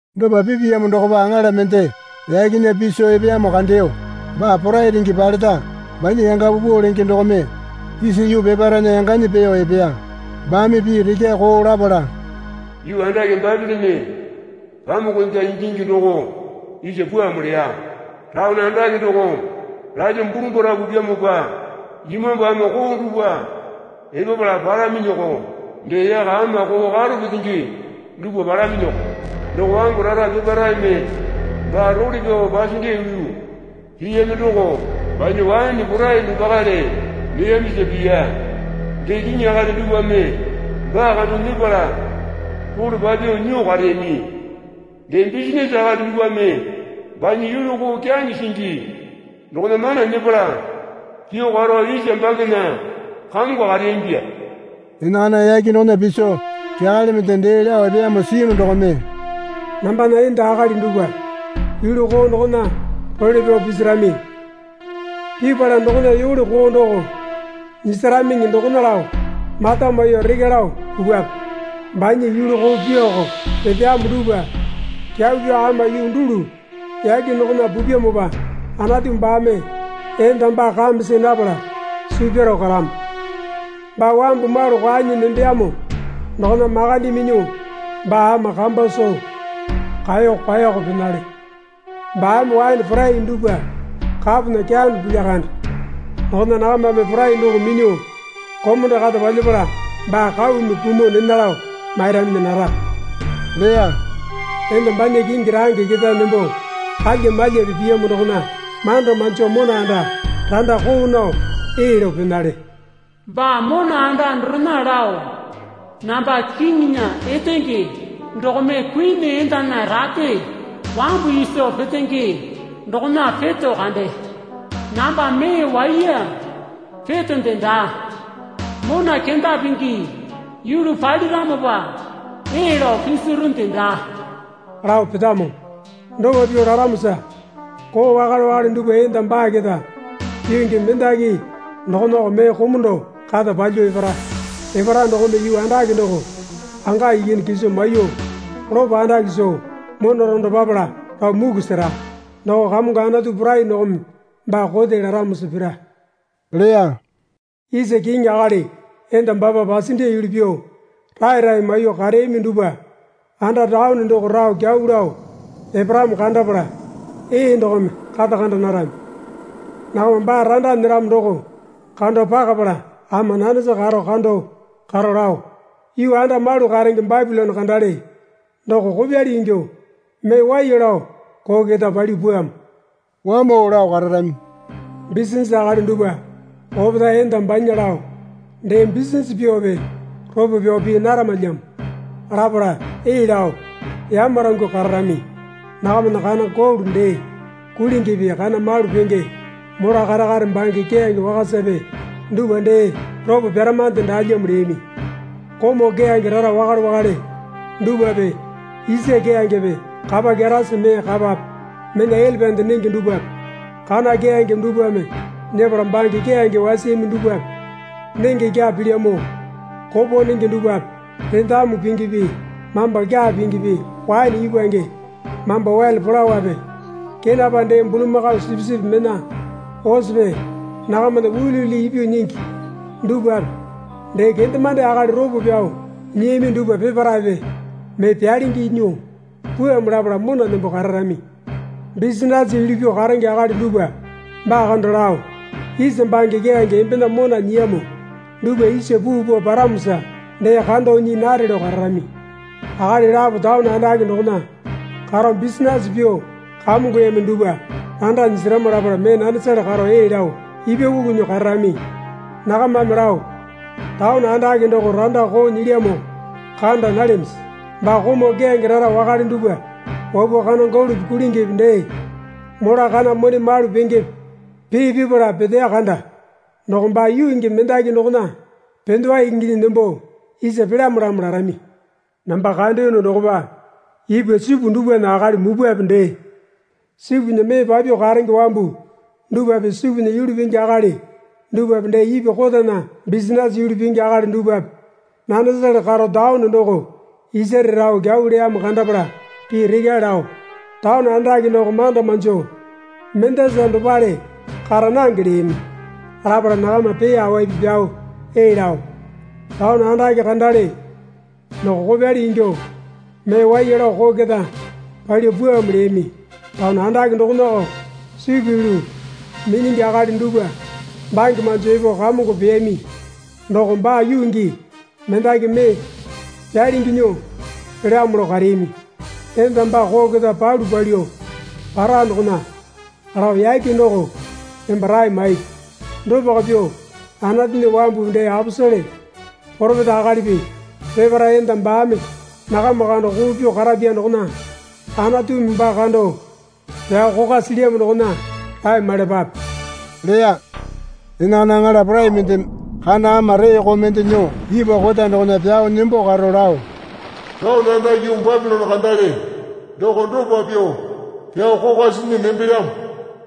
Dopa pipeyamo dokopa aŋala mende yakena piso epeyamo kandeyo. Baa porai renge paleta banya yanga paupau lenge dokome isa yuu peparaena yanganyi peeyo epeya. Baame pii rekyae koo lapala, Yuu andake Bapilone pamuku enda ingingi doko isa pwuamo leya. Taone andake doko lalyuo burumbara pupyamopa imambu ama koo dupwa epapala palaminyiko. Dee yaka ama koo karo petenge dupwa palaminyiko. Doko wambu rara peparaeme baa role pyao pasendiya yulu piyami doko banya waene porai dopakale neyamisa piya. Dee kiŋi akali dupwame baa kando nyepala role papyuo nyuo kareyami. Dee bisinase akali dupwame banya yulu koo kyaŋe singi dokona mana nyepala pyuo karo isa bangena kamongo kareyamipya. Enakana yake dokona piso kyakale mende dee lao epeyamo siyunu dokome, Nambana enda akali dupwa yulu koo dokona role pyao pisarami. Pipala dokona yole koo doko nyisaramiŋi dokona lao mata maiyuo rekya lao pupwape. Banya yulu koo pyuoko peteyamo dupwa kyau pyao ama yuu dulu yake dokona pupyamopa Anatu baame enda baa kame see napala suu pyaro karamo. Baa wambu malu kwaenyi nembeyamo dokona makande minyuo baa ama kamba soo kaeyo kwaoko penale. Baame waene porai dupwa kapona keyano pilya kande dokona nakamame porai doko minyuo komondo kata palyapala baa kaumi kumuo nena lao mairaminyi nara leya. Enda banya kingi range ketae nembo kalya malyape piyamo dokona manda manjo mona anda randa koo nao ee lao penale. Baa mona anda dorena lao namba kiŋinya etenge dokome kuini endana rate wambu iso petenge dokona peto kande. Namba mee waiya petonde daa. Mona kenda pingi yulu paliramopa ee lao pisirunde daa lao petamo. Dopa pyuo laramosa koo wakale wakale dupwa enda baa keta yuu gii mendaki dokonako mee komondo kata palyuo epara. Epara dokome yuu andake doko anga ikyane kiso maiyuo lopo andake soo mona rando papala rao muku sera. Doko Kamongo Anatu Porai dokome baa kote laramosa pira leya. Isa kiŋi akali enda baapa pasendiya yulu pyuo rae rae maiyuo kareyami dupwa anda taone doko rao kyau lao eparamo kandapala ee dokome kata kanda narami. Nakama baa randa nyeramo doko kando pakapala ama nanesa karo kando karo lao, Yuu anda malu karenge Bapilone kandale doko kopyali ingyuo mee waiya lao koo keta palyuo pwuamo, wamao lao kararami. Bisinase akali dupwa opetae enda banya lao dee bisinase pyuope ropo pyao pii naramalyamo lapala ee lao yamarangyuo kararami. Nakamana kana golo dee kulingipi kana malu penge mola kare kare bange keyange wakasape dupwa, dee ropo pyaramande daalyamo leyami. Komau keyange rara wakale wakale dupwape isa keyangepe kapa kyarasi mee kapape mena elepande nenge dupwape kana keyangepe dupwame nyepala bange keyange wasiyami dupwape nenge kyaa pilyamo, kopo nenge dupwape rendamu pingipi mamba kyaa pingipi waene ipwange mamba wele polawape kenapa dee bulamakao sipisipi mena osepe nakamana uliuli ipyuo nyingi dupwape dee kendemande akali ropo pyao nyiyami dupwa peparaepe mee pyalingi nyuo pwuamo lapala mona nembo kararami. Bisinase yulu pyuo karenge akali dupwa baa kando lao, Isa bange keyange embena mona nyiyamo dupwa isa puu pao paramosa dee kando nyii nare lao kararami. Akali lapo taone andake dokona karo bisinase pyuo kamongoyami dupwa randa nyisarama lapala mee nanesale karo ee lao ipwakuku nyuo kararami. Nakamame lao, Taone andake doko randa koo nyilyamo kanda nalyamisi? Baa komau keyange rara wakale dupwa wapuo kana golope kulingipi dee mola kana mone malu pengepe pee pipala peteya kanda. Doko baa yuu gii mendaki dokona pendewa inginyi nembo isa pelyamolamo larami. Namba kandeyono dokopa ipwa sipu dupwana akali mupwape dee sipunya mee papyuo karenge wambu dupwape sipunya yulu pingi akali dupwape dee ipwa kotana bisinase yulu pingi akali dupwape nanesale karo taone doko isare rao kyau leyamo kandapala pii rekyae lao, Taone andake doko manda manjo mendasa dopale kara nange leyami. Lapala nakama pee awaipi pyao ee lao, Taone andake kandale doko kopyali ingyuo mee waiya lao koo keta palyuo pwuamo leyami. Taone andake dokonako sipu yulu minyingi akali dupwa bange manjo epo kamongo peyami. Doko baa yuu gii mendaki mee pyalingi nyuo pelyamo lao kareyami. Enda baa koo keta palu palyuo para dokona lao yake doko emba rae maipi. Dopako pyuo Anatunya wambupi dee aposele poropeta akalipi peparae enda baame nakama kando koo pyuo karapya dokona Anatumi baa kando pyao kokwa silyamo dokona rae maiyalapape leya. Enakana aŋala porai mendeme kana ama reeko mende nyuo ipwa kota dokona pyao nembo karo lao, Taone andake yuu Bapilone kandale doko dopa pyuo pyao kokwa sinyi nembelyamo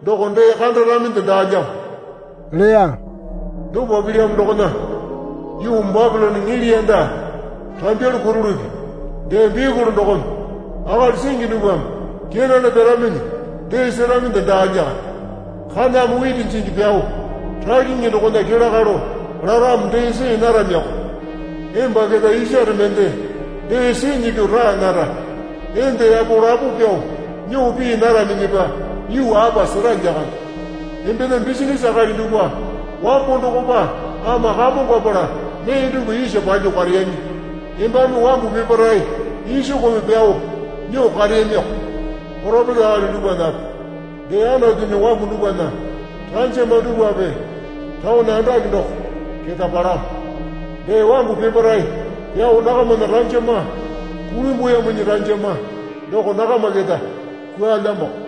doko dee kandaraminde daalyamo leya. Dopa pilyamo dokona yuu Bapilone niliyanda rambyalu kurulupi dee bikuli dokome akali singi dupwame kenane pyaraminyi dee seraminde daa lyakande. Kaname witi jingi pyao rakyingi dokona kelakalo laramo dee see naramiyoko. Emba keta isare mende dee sinyi pyuo raa nara. Enda yapo lapo pyao nyuo pii naraminyipa yuu apa sera lyakande. Embena bisinase akali dupwa wambo dokopa ama kamongapala mee dupwa isa palyuo kareyami. Embame wambu peparae isokome pyao nyuo kareyamiko. Poropeta akali dupwanape dee Anatunya wambu dupwana ranjama dupwape taone andake doko keta palamo. Dee wambu peparae pyao nakamana ranjama kulimbuyaminyi ranjama doko nakama keta kwualyamoko.